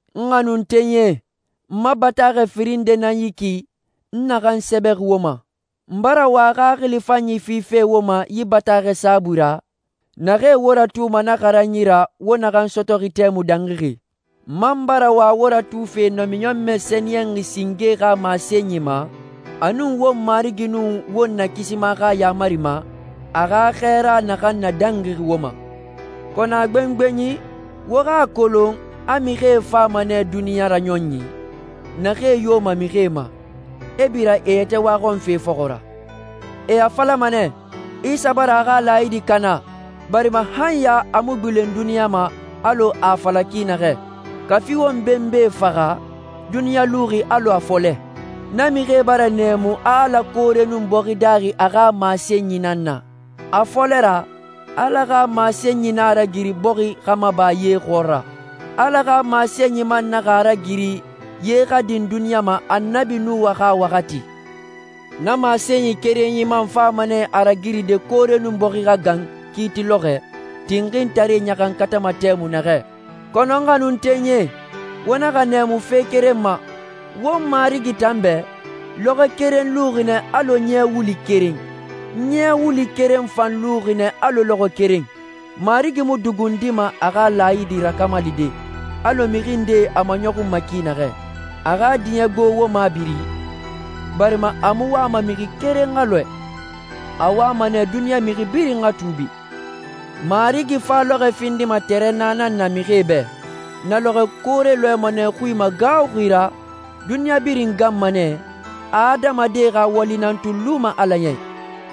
N xanuntenyie, n ma bataaxɛ firin nde nan yi ki, n naxan sɛbɛ wo ma. N bara wa xaxili fanyi fife wo ma yi bataaxɛe saabui ra, naxee wo ratuma na xaranyi ra wo naxan sɔtɔxi tɛmui dangixi. N man bara wa wo ratufe namiɲɔnmɛ sɛniyɛnxi singee xa masenyi ma, a nun won Marigi nun won Nakisima xa yaamari ma, a xa xɛɛrae naxan nadangixi wo ma. Kɔnɔ a gbengbenyi, wo xa a kolon a mixie fama nɛ duniɲa raɲɔnyi, naxee yoma mixie ma, e bira e yɛtɛ waxɔnfe fɔxɔ ra. E a falama nɛ, «Isa bara a xa laayidi kana, barima han ya a mu gbilen duniɲa ma alɔ a a fala ki naxɛ. Kafi won benbae faxa, duniɲa luxi alɔ a fɔlɛ.» Na mixie bara nɛɛmu a Ala koore nun bɔxi daaxi a xa masenyi nan na. A fɔlɛ ra, Ala xa masenyi nan a ragiri bɔxi xa maba ye xɔɔra. Ala xa masenyi man naxa a ragiri ye xa din duniɲa ma Annabi Nuha xa waxati. Na masenyi kerenyi man fama nɛ a ragiride koore nun bɔxi xa gan kiiti lɔxɔɛ, tinxintaree ɲaxankatama tɛmui naxɛ. Kɔnɔ, n xanuntenyie, wo naxa nɛɛmu fe keren ma: Won Marigi tan bɛ, lɔxɔɛ keren luxi nɛ alɔ ɲɛ wulu keren, ɲɛ wulu keren fan luxi nɛ alɔ lɔxɔɛ keren. Marigi mu dugundima a xa laayidi rakamalide, alɔ mixi ndee a maɲɔxunma ki naxɛ. A xa diɲɛ gbo wo mabiri, barima a mu wama mixi keren xa lɔɛ. A wama nɛ duniɲa mixi birin xa tuubi. Marigi fa lɔxɔɛ findima tɛrɛnna nan na mixie bɛ. Na lɔxɔɛ koore lɔɛma nɛ xui magaaxuxi ra, duniɲa birin ganma nɛ, adamadie xa wali nan tun luma Ala ya i.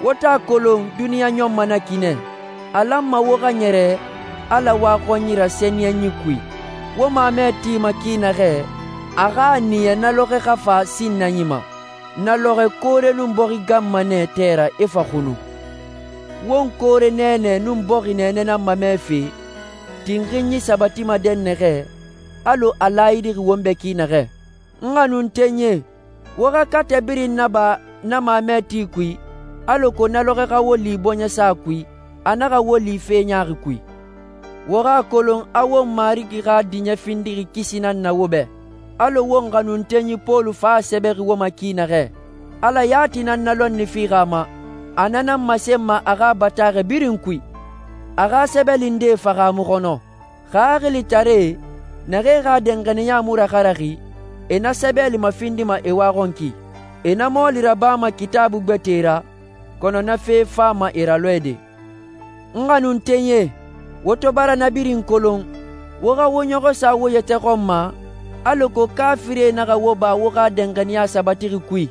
Wo to a kolon duniɲa ɲɔnma na ki nɛ, a lanma wo xa ɲɛrɛ Ala waxɔnyi ra sɛniyɛnyi kui. Wo mamɛ tima ki naxɛ, a xa a niya na lɔxɔɛ xa fa sinnanyi ma. Na lɔxɔɛ koore nun bɔxi ganma nɛ tɛ ra, e fa xunu. Won koore nɛɛnɛ nun bɔxi nɛɛnɛ nan mamɛfe, tinxinyi sabatima dɛnnaxɛ, alɔ a laayidixi won bɛ ki naxɛ. N xanuntenyie, wo xa katɛ birin naba na mamɛ ti kui, alako na lɔxɔɛ xa wo li bɔɲɛsa kui, a naxa wo li fe ɲaaxi kui. Wo xa a kolon a won Marigi xa diɲɛ findixi kisi nan na wo bɛ, alɔ won xanuntenyi Pɔlu fan a sɛbɛxi wo ma ki naxɛ. Ala yati nan na lɔnni fixi a ma. A na nan masenma a xa bataaxɛ birin kui. A xa sɛbɛli ndee fahaamu xɔnɔ. Xaxilitaree, naxee xa danxaniya mu raxaraxi, e na sɛbɛlie mafindima e waxɔnki. E na mɔɔli rabama Kitaabui gbɛtɛe ra, kɔnɔ na fe fama e ralɔɛde. N xanuntenyie, wo to bara na birin kolon, wo xa wo ɲɔxɔ sa wo yɛtɛ xɔn ma, alako kaafirie naxa wo ba wo xa danxaniya sabatixi kui.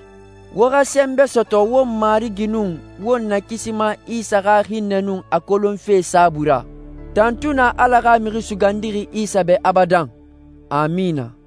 Wo xa sɛnbɛ sɔtɔ won Marigi nun won Nakisima Isa xa hinnɛ nun a kolonfe saabui ra. Tantui na Ala xa Mixi Sugandixi Isa bɛ abadan. Amina.